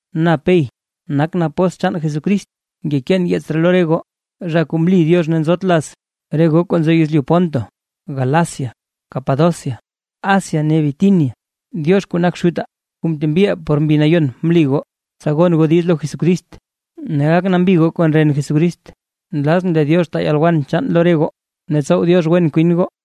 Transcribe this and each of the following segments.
Na Pey nakʼn apóstl chaan Jesucrist, ngekeen yeets ree lo re goo, zha kuu mli Diox ne nzot laz, re goo kuu nzo yezlyu Ponto, Galacia, Capadocia, Asia ne Bitinia. Diox kuu nak Xutaa kuu ntembiʼaa por Mbi Nayon mli goo, tsa gon goo diiz lo Jesucrist ne gak nambi goo kon ren Jesucrist. Nlazʼn lee Diox taa yalwen chaan lo re goo ne tsow Diox wen kwin goo.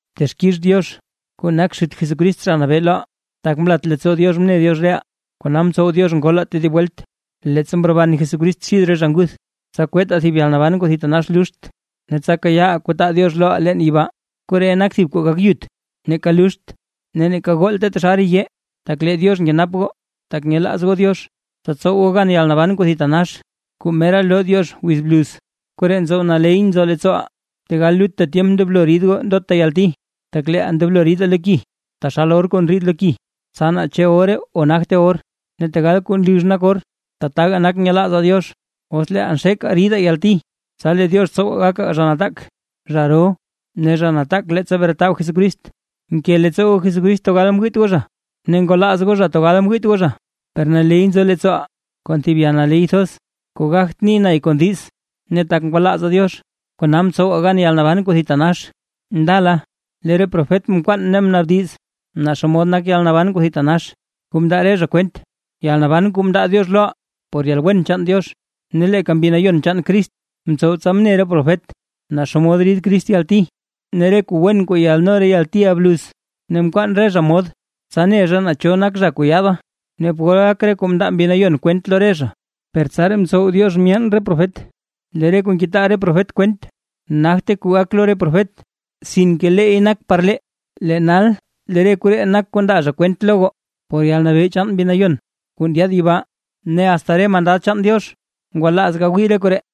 Texkix Diox kuu nak Xut Jesucrist Zha Nabee loʼaa. Tak mlat leettsoo Diox mne Diox reʼaa kona mtsow Diox ngolaa tedib welt, leettsa mroban Jesucrist xid re zha nguth, tsa kwettaa thib yalnaban kuu thitanax luxt, ne tsa kayaaʼaa kuu taa Diox loʼaa leen yibaa, koree nak thib kuu gak yut neeka luxt ne neeka goolta taxal re yee, tak lee Diox nkenap goo, tak nyelaaz goo Diox, tsa tsow goo gan yalnaban kuu thitanax kuu mera loo Diox wiz bluz. Koree ntsow naley nzo leettsooʼaa, tegal lutta tyemp ndoblo rid goo ndota yalti. Tak leeʼaa ndoblo ridaa lo ki, taxal or kuu ndriid lo ki, tsa naa chu ore o nagte or ne tegal kuu nlux nak or. Tataga nak nyelaazaa Diox os leeʼaa xekaa ridaa yalti, tsa lee Diox tsow gakaa zha nataak, zha roo ne zha nataak leettsa bretab Jesucrist. Nke leettsoo goo Jesucrist tegal mwiit goo zha, ne ngwalaaz goo zha tegal ngwiit goo zha, per naley nzo leettsooʼaa kon thib yalnaley thoz kuu gagt ni lee kon diiz, ne tak ngwalaazaa Diox kona mtsowaa gan yalnaban kuu thitanax. Ndala lee re profet mkwaan ne mnnaabdiz naa xomod nak yalnaban kuu thitanax kuu mndaa re zha kwent, yalnaban kuu mndaa Diox loʼaa por yalwen chaan Diox. Ne leeka Mbi Nayon chaan Crist mtsow tsa mne re profet naa xomod rid Crist yalti ne re kuu wen kuu yaadno re yaltiʼa bluz; ne mkwaan re zha mod, tsa ne zha naa cho nak zha kuu yaada, ne pol gak re kuu mndaa Mbi Nayon kwent lo re zha. Per tsaraa mtsow Diox myeen re profet lee re kuu ngetaa re profet kwent, nagte kuu gak lo re profet sinke leey nak par lee. Lee nal lee re koree nak kuu ndaa zha kwent lo goo por yalnabee chaan Mbi Nayon kuu ndyaad yibaa. ¡Ne asta re mandad chaan Diox ngwalaaz gawii re koree!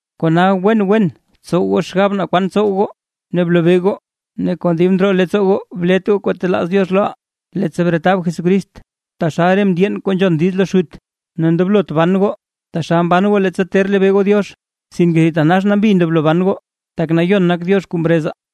Kona wen wen btsow goo xgab naa kwan tsow goo ne blobee goo. Ne kon dib ndroo leettsoo goo blet goo kuu talaaz Diox loʼaa, leettsa bretab Jesucrist. Taxal re mndyeen kuu nzhon diiz lo xut, ne ndoblot ban goo taxal mban goo leettsa ter lebee goo Diox. Sinke thitanax nambi ndoblo ban goo, tak nayon nak Diox kuu mrezaa;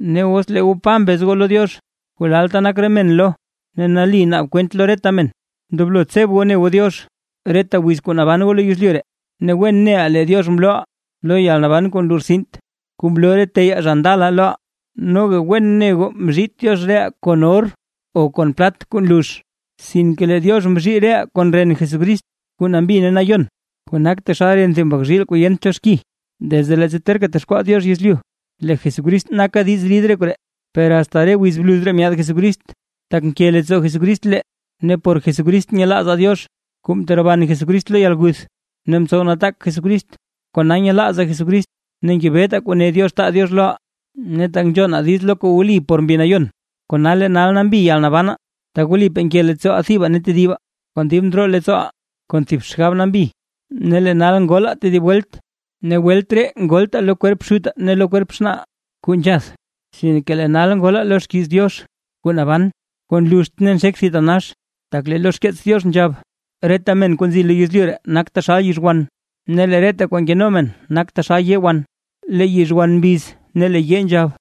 Ne os lee goo “Pa” mbez goo lo Diox kuu lalta nak re men lo, ne nali naab kwent lo reta men, ndoblo tseb goo ne goo Diox reta wiz kuu naban goo lo yezlyu ree. Ne wen neʼaa lee Diox mlooʼaa lo yalnaban kuu nlortsint kuu mloo re teyaa zha ndala loʼaa; noga wen ne goo mzhiit Diox reʼaa kon or o kon plat kuu nlux, sinke lee Diox mzhii reʼaa kon ren Jesucrist kuu nambi ne nayon, kuu nak taxal ren chaan thib mbak zhiil kuu yent cho xki. Desde leettsa terka texkwaa Diox yezlyu lee Jesucrist naka diiz rid re koree; per asta re wiz bluz ree myaad Jesucrist, tak nke leettsoo Jesucrist lee. Ne por Jesucrist nyelaazaa Diox kuu mteroban Jesucrist lo yalguth ne mtsow nataak Jesucrist; kona nyelaazaa Jesucrist ne ngebetaa kuu ne Diox taa Diox loʼaa. Ne tak nzhonaa diiz lo kuu wli por Mbi Nayon, kona lee nal nambi yalnabanaa, tsa wlipaa nke leettsooʼaa thibaa ne tedibaa kon dib ndroo leettsooʼaa, kon thib xgab nambi. Ne lee nal ngolaa tedib welt, ne welt ree ngoltaa lo kwerp xutaa ne lo kwerp xnaaʼaa kuu nzhath, sinke lee nal ngolaa lo xkiiz Diox kuu naban kuu nluxt ne nxek thitanax. Tak lee lo xkeets Diox nzhab: Reta men kuu nzi lo yezlyu ree nak taxal yizhwan, ne lee reta kwaa nkeno men nak taxal yee wan. Lee yizhwan mbiz ne lee yee nzhab.